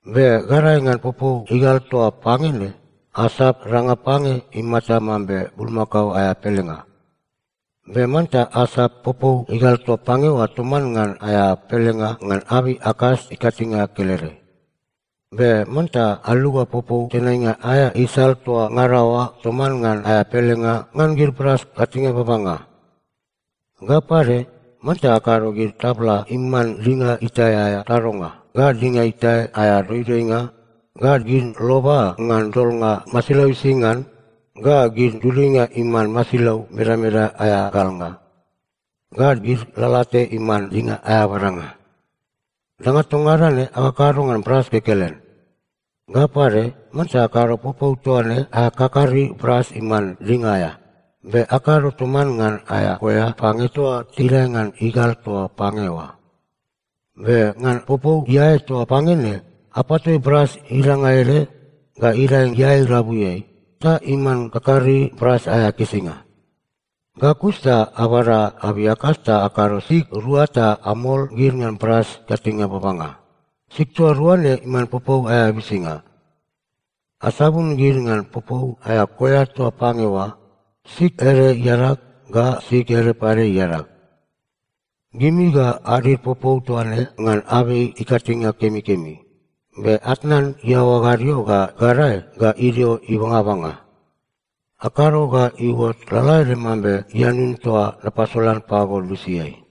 Be gadae ngan popou igal toa pange ne, asap danga pange imata mambe bulmakao aea pelenga. Be manta asap popou igal toa pange oa toman ngan aea pelenga ngan abei akas ikatinge kelede. Be manta aluga popou tenainga aea isal toa ngada oa toman ngan aea pelenga ngan gid bras ikatinge babanga. Ga pade, manta akado gid tabla iman dinga itae aea tadonga, ga dinga itae aea doidoinga, ga gid loba ngan dolnga masilau ising ngan, ga gid duduinga iman masilau imedameda aea galnga, ga gid lalate iman dinga aea badanga. Danga toa ngada ne akakado ngan bras kekelen. Ga pade, manta akado popou toa ne aea kakari bras iman dinga aea. Be akado toman ngan aea koea pange toa tidae ngan igal toa pange oa. Be ngan popou iae toa pange ne, apatoi bras idanga ede ga idae iae irabuiai, ta iman kakari bras aea kisinga. Ga kus ta abada abei akas ta akado sig rua ta amol gid ngan bras ikatinge babanga. Sig toa rua ne iman popou aea bisinga. Asabun gid ngan popou aea koea toa pange oa, sig ede iadag, ga sig ede pade iadag. Gimi ga adid popou toa ne ngan abei ikatinge kemikemi, be atnan iaoa gadio ga gadae ga idio ibangabanga. Akado ga iuot lalaede mambe ianun toa napasolan pago lusiai.”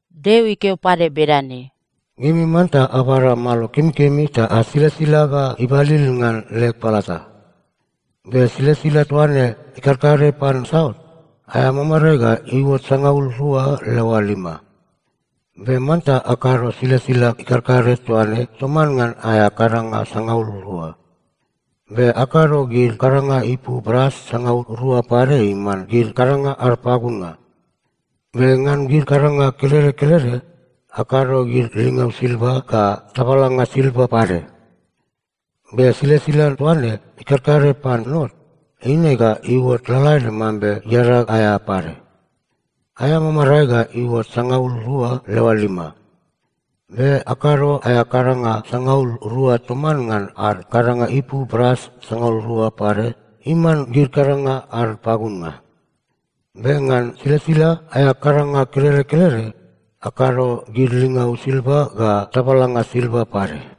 Deo ikeo pade bedane, “Gimi manta abada malo kemikemi ta asilasila ga ibalil ngan leg palata. Be silasila toa ne ikarkare pan saut, aea mamarae ga iuot sangaul rua leoa lima. Be manta akado silasila ikarkare toa ne toman ngan aea kadanga sangaul rua. Be akado gid kadanga ipu bras sangaul rua pade iman gid kadanga ad pagunnga. Be ngan gid kadanga kelede kelede, akado gid lingau silva ga tabalanga silva pade. Be silasila toa ne ikarkare pan not, eine ga iuot lalaede mambe iadag aea pade. Aea mamarae ga iuot sangaul rua leoa lima. Be akado aea kadanga sangaul rua toman ngan ad kadanga ipu bras sangaul rua pade iman gid kadanga ad pagunnga. Be ngan silasila aea kadanga kelede kelede, akado gid lingau silva ga tabalanga silva pade.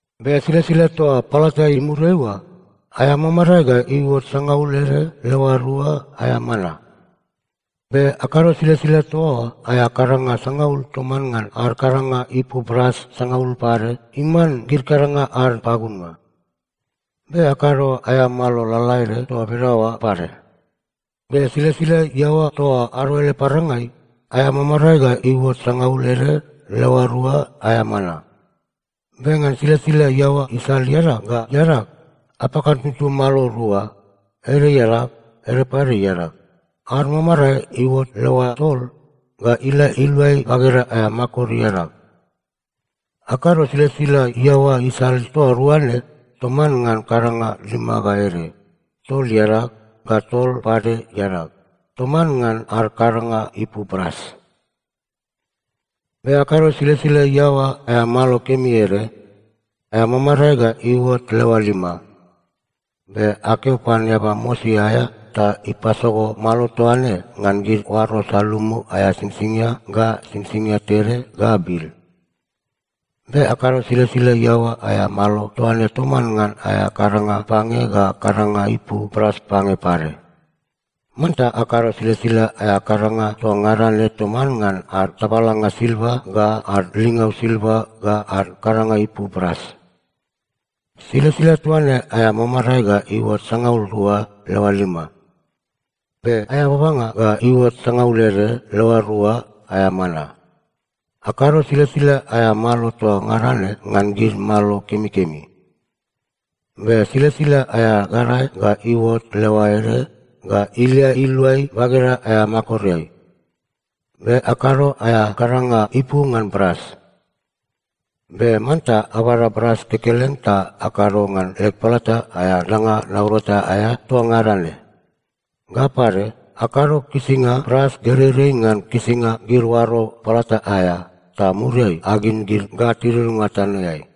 “Be silasila toa palata imuriai oa, aea mamarae ga iuot sangaul ede leoa rua aea mana. Be akado silasila toa oa aea kadanga sangaul toman ngan ad kadanga ipu bras sangaul pade iman gid kadanga ad pagunnga. Be akado aea malo lalaede toa bedaoa pade. Be silasila iaoa toa ado ele parangai, aea mamarae ga iuot sangaul ede leoa rua aea mana. Be ngan silasila iaoa isal iadag ga iadag, apakantutu malo rua, ede iadag, ede pade iadag, ad mamarae iuot leoa tol ga ilia iluai bageda aea makor iadag. Akado silasila iaoa isal toa rua ne toman ngan kadanga lima ga ede, tol iadag, ga tol pade iadag, toman ngan ad kadanga ipu bras. “Be akado silasila iaoa aea malo kemi ede, aea mamarae ga iuot leoa lima. Be akeo pan eaba mosi aea ta ipasogo malo toa ne ngan gid oaro salumu aea singsingia ga singsingia tede ga bil. Be akado silasila iaoa aea malo toa ne toman ngan aea kadanga pange ga kadanga ipu bras pange pade. Manta akado silasila aea kadanga toa ngada ne toman ngan ad tabalanga silva ga ad lingau silva ga ad kadanga ipu bras. Silasila toa ne aea mamarae ga iuot sangaul rua leoa lima. Be aea babanga ga iuot sangaul ede leoa rua aea mana. Akado silasila aea malo toa ngada ne ngan gid malo kemikemi. Be silasila aea gadae ga iuot leoa ede ga ilia iluai bageda aea makoreai. Be akado aea kadanga ipu ngan bras. Be manta abada bras kekelen ta akado ngan leg palata aea danga naurata aea toa ngada ne. Ga pade, akado kisinga bras gereirei ngan kisinga gid oaro palata aea, ta muriai agin gid ga tidudunga tanoeai.”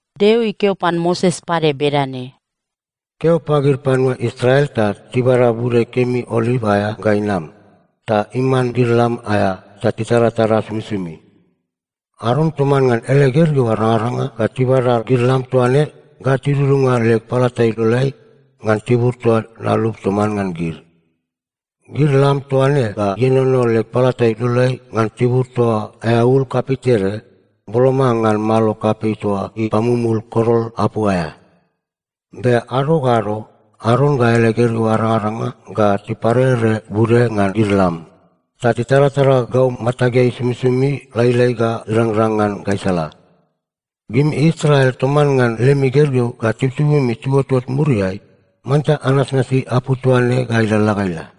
Deo ikeo pan Moses pade bedane, “Keo pagid panua Israel ta tibada bude kemi oliv aea ga inam, ta iman gid lam aea ta titaratara somisomi. Aron toman ngan ele gergeu arangaranga ga tibada gid lam toa ne ga tidudunga leg palata iloleai ngan tibur toa nalup toman ngan gid. Gid lam toa ne ga ienono leg palata iloleai ngan tibur toa aea ul kapei tede, boloma ngan malo kapei toa ipamumul korol apu aea. Be ado ga ado, Aron ga ele gergeu arangaranga ga tiparere bude ngan gid lam, ta titaratara gau matageai somisomi lailai ga irangrang ngan gaisala. Gimi Israel toman ngan lemi gergeu ga tibutibumi tiuotot muriai, manta anasnasi apu toa ne ga ilalala ga ila.”